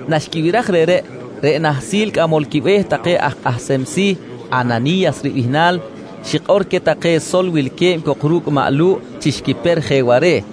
Naxquibiraj reꞌreꞌ, reꞌ nahsil cꞌamol quibe̱h take aj kꞌahsem si̱ Anani̱yas ribihnal xikꞌor queh take sol wilque̱b cok ru̱cꞌ maꞌ Lu̱ꞌ chi xquiper je ware̱.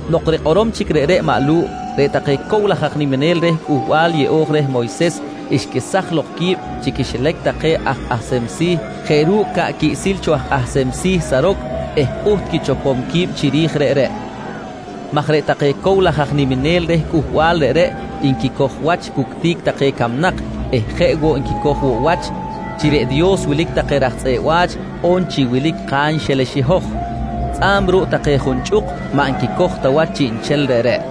Nok rikꞌorom chic reꞌreꞌ i maꞌ Lu̱ꞌ, reꞌ take cow laj aj niminel reh Cꞌuhbal Yeꞌo̱j reh Moyses xquesaj lok qui̱b chi quixilac take aj kꞌahsem si̱ jeꞌ ru̱cꞌ ca̱ꞌ quiꞌsil cho aj kꞌahsem si̱ Saroc eh pꞌuht quichopom qui̱b chiri̱j reꞌreꞌ maj reꞌ take cow laj aj niminel reh cꞌuhbal reꞌreꞌ nquicoj wach cuctic take camnak eh jeꞌ woꞌ nquicoj woꞌ wach chi reꞌ Dios wilic take raj tzꞌeꞌ wa̱ch on chi wilic kanxelex i hoj. Tzꞌa̱b ruꞌ take junchꞌuk, maꞌ nquicoj ta wach chiꞌnchel reꞌreꞌ.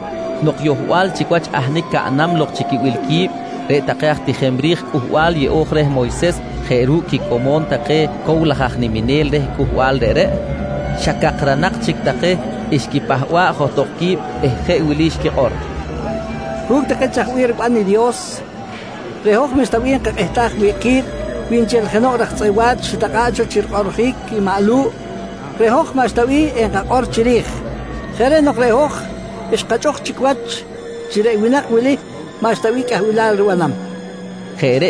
Nok yohbal chic wach ahnic caꞌnam lok chi quibil qui̱b, reꞌ take aj tijem ri̱j Cꞌuhbal Yeꞌo̱j reh Moyses jeꞌ ru̱cꞌ quicomo̱n take cow laj aj niminel reh cꞌuhbal reꞌreꞌ, xa cakranak chic take xquipahba̱ꞌ johtok qui̱b eh jeꞌ wili xquikꞌor: «Ru̱cꞌ take chaj bih riban i Dios, reꞌ hoj maꞌxta bih enkakꞌihtaj wi̱ꞌ ki̱b. Wi nchel jenoꞌ raj tzꞌeꞌ wa̱ch xitakꞌa̱ꞌ cho chi rikꞌoꞌrjic i maꞌ Lu̱ꞌ, reꞌ hoj maꞌxta ta bih enkakꞌor chiri̱j. Jeꞌ reꞌ nok reꞌ hoj xkachꞌuk chic wach chi reꞌ winak wili maꞌxta bih cꞌahbilal ribanam, nqui take.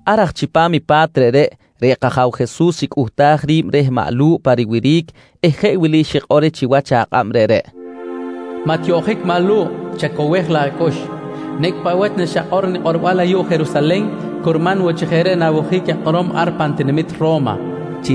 Ar aj chipam i pa̱t reꞌreꞌ, reꞌ kAja̱w Jesus xicꞌuhtaj ri̱b reh maꞌ Lu̱ꞌ pa riwiric eh jeꞌ wili xikꞌor reh chiwach akꞌab reꞌreꞌ: «Maꞌ tiyoꞌjic maꞌ Lu̱ꞌ chacowej laꞌ acꞌux. Nicꞌ paꞌ wach naxakꞌor nikꞌorbal ayuꞌ Jerusalen curman woꞌ chi jeꞌ reꞌ na̱wojic akꞌorom ar pan tinamit Ro̱ma, nqui xikꞌor reh.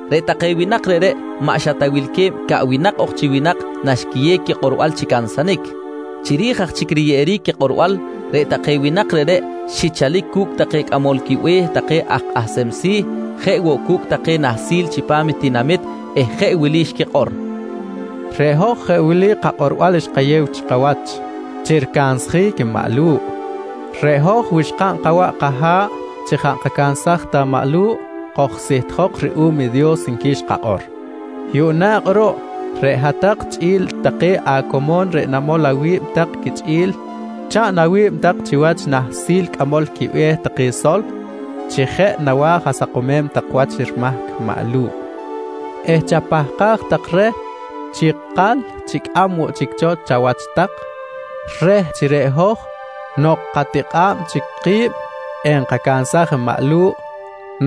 Reꞌ take winak reꞌreꞌ maꞌ xa ta wilque̱b caꞌwinak ok chi winak naxquiyew quikꞌorbal chi cansanic. Chiri̱j aj chic riyeꞌeric quikꞌorbal, reꞌ take winak reꞌreꞌ xichalic cu̱cꞌ take cꞌamol quibe̱h take aj kꞌahsem si̱, jeꞌ woꞌ cu̱cꞌ take nahsil chipam tinamit eh jeꞌ wili xquikꞌor: «Reꞌ hoj jeꞌ wili kakꞌorbal xkayew chikawach chi ricansjic i maꞌ Lu̱ꞌ: ‹Reꞌ hoj wi xkaꞌn kawaꞌ kaha̱ꞌ chi jaꞌ nkacansaj ta maꞌ Lu̱ꞌ, kojsihtjok ruꞌum i Dios, nqui xkakꞌor. «Yuꞌna kꞌuruꞌ reꞌ hat-tak chꞌi̱l take acomo̱n reꞌ namol awi̱b tak quichꞌi̱l, chaꞌn awi̱b tak chiwach i nahsil cꞌamol quibe̱h take sol chi jeꞌ nawa̱j asakomem tak wach rimahc maꞌ Lu̱ꞌ eh chapahkaj tak reh chi ikal chicꞌam woꞌ chic cho chawach tak reh chi reꞌ hoj nok katikꞌa̱b chic ki̱b, enkacansaj i maꞌ Lu̱ꞌ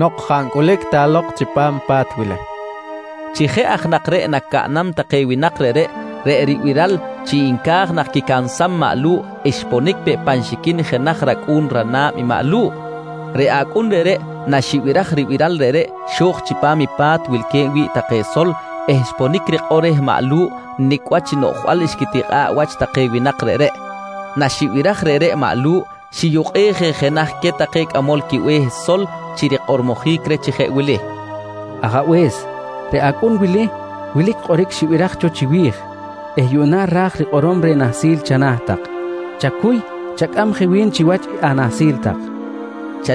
nok jaꞌ ta ncꞌulic lok chipam i pa̱t wili, nqui take. Chi jeꞌ aj nak reꞌ nacaꞌnam take winak reꞌreꞌ, reꞌ ribiral chi nca̱j nak quicansam maꞌ Lu̱ꞌ, xponic peꞌ pan xiquin i jenaj racꞌu̱n rana̱b i maꞌ Lu̱ꞌ. Reꞌ acꞌun reꞌreꞌ naxibiraj ribiral reꞌreꞌ xo̱j chipam i pa̱t wilque̱b wi̱ꞌ take sol eh xponic rikꞌor reh maꞌ Lu̱ꞌ nicꞌ wach i noꞌjbal xquitikꞌa̱ꞌ wach take winak reꞌreꞌ. Naxibiraj reꞌreꞌ maꞌ Lu̱ꞌ, xiyukꞌej je jenaj queh take cꞌamol quibe̱h sol chi rikꞌormojic reh chi jeꞌ wili: «Ajabe̱s, reꞌ acꞌun wili wilic kꞌoric xibiraj cho chiwi̱j eh yuꞌna ra̱j rikꞌorom reh nahsil chana̱ tak. Chacuy, chacꞌam je wi̱n chiwach anahsil tak, nqui reh.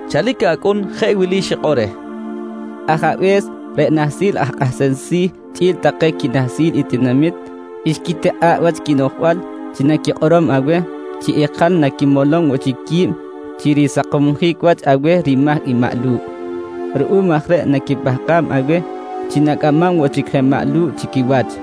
Chalic acꞌun jeꞌ wili xikꞌor reh: «Ajabe̱s, reꞌ nahsil aj kꞌahsem si̱ chꞌi̱l take quinahsil i tinamit xquitikꞌa̱ꞌ wach quinoꞌjbal chi naquikꞌorom aweh, chi ikal naquimolom woꞌ chic qui̱b chi risakomsjic wach aweh rimahc maꞌ Lu̱ꞌ. Ruꞌum aj reꞌ naquipahkam aweh chi na̱cꞌamam woꞌ chic je maꞌ Lu̱ꞌ chi quiwach,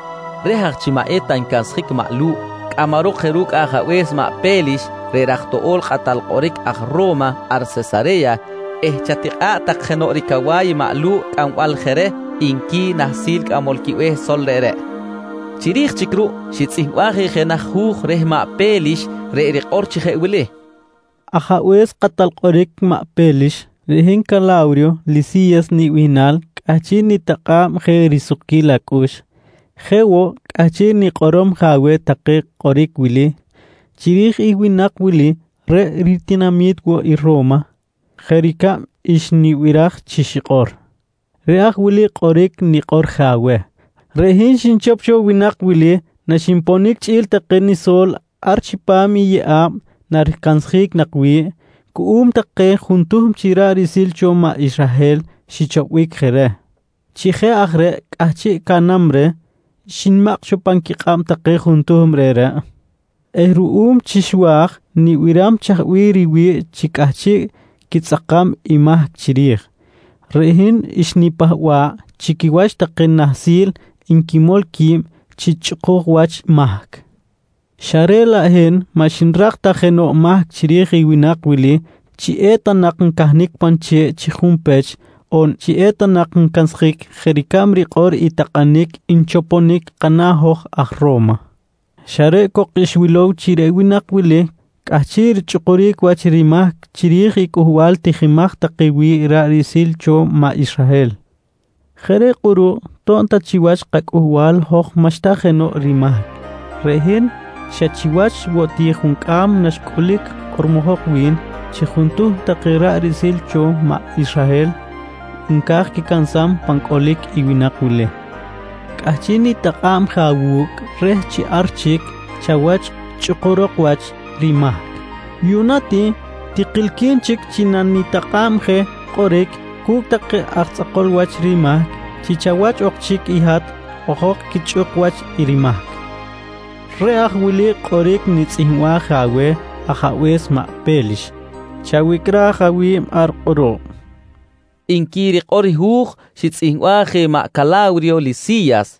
Reh aj chi maꞌ eta ncansjic i maꞌ Lu̱ꞌ, cꞌamarok je ru̱cꞌ ajabe̱s maꞌ Pe̱lix reꞌ raj toꞌo̱l kꞌatal kꞌoric aj Ro̱ma ar Sesare̱ya eh chatikꞌa̱ꞌ tak jenoꞌ ricawa̱y i maꞌ Lu̱ꞌ cꞌambal je reh, nqui nahsil cꞌamol quibe̱h sol reꞌreꞌ. Chiri̱j chic ruꞌ xitzꞌihmbaj je jenaj hu̱j reh maꞌ Pe̱lix reꞌ rikꞌor chi jeꞌ wili: «Ajabe̱s kꞌatal kꞌoric maꞌ Pe̱lix: Reꞌ hin Cala̱wriyo Lisi̱yas nibihnal cꞌahchiꞌ nitakꞌa̱b je risukquil acꞌux. Jeꞌ woꞌ cꞌahchiꞌ nikꞌorom je aweh take kꞌoric wili chiri̱j i winak wili reꞌ ritinami̱t woꞌ i Ro̱ma jeꞌ ricab xnibiraj chi xikꞌor. Reꞌ aj wili kꞌoric nikꞌor je aweh: Reꞌ hin xnichop cho winak wili naxinponic chꞌi̱l take niso̱l ar chipam i yeꞌa̱b naricansjic nak wi̱ꞌ cuꞌum take juntuhm chi ra̱ꞌ riꞌsil cho maꞌ Israhel xichopbic je reh. Chi jeꞌ aj reꞌ cꞌahchiꞌ caꞌnam reh, xnimakꞌ cho pan quikꞌab take juntuhm reꞌreꞌ eh ruꞌum chi xwa̱j nibiram chaj bih riwi̱ꞌ chi cꞌahchiꞌ quitzꞌakam i mahc chiri̱j, reꞌ hin xnipahba̱ꞌ chi quiwach take nahsil nquimol qui̱b chi chꞌukuj wach mahc xa reꞌ laꞌ hin maꞌ xnirak ta jenoꞌ mahc chiri̱j i winak wili chi eta nak ncahnic pan che̱ꞌ chi junpech on chi eta nak ncansjic jeꞌ ricab rikꞌor i takꞌanic nchoponic kana̱ hoj aj Ro̱ma. Xa reꞌ cok xwilow chi reꞌ winak wili cꞌahchiꞌ richꞌukuric wach rimahc chiri̱j i cꞌuhbal tijimaj take wi̱ꞌ ra̱ꞌ riꞌsil cho maꞌ Israhel. «Jeꞌ reꞌ kꞌuruꞌ to̱b ta chiwach kacꞌuhbal hoj maꞌxta jenoꞌ rimahc, reꞌ hin xa chiwach woꞌ ti juncꞌam naxcꞌulic kꞌormojok wi̱n chi juntuhm take ra̱ꞌ riꞌsil cho maꞌ Israhel nca̱j quicansam pan cꞌolic i winak wili, cꞌahchiꞌ nitakꞌa̱b je awu̱cꞌ reh chi ar chic chawach chꞌukurok wach rimahc. Yuꞌna ti tikilqui̱n chic chi nanitakꞌa̱b je kꞌoric cu̱cꞌ take aj tzꞌakol wach rimahc chi chawach ok chic i hat ojok quichꞌuk wach rimahc. Reꞌ aj wili kꞌoric xnitzꞌihmbaj je aweh ajabe̱s maꞌ Pe̱lix. Chawicꞌraj awi̱b ar kꞌuruꞌ, nqui rikꞌor hu̱j xitzꞌihmbaj je maꞌ Cala̱wriyo Lisi̱yas.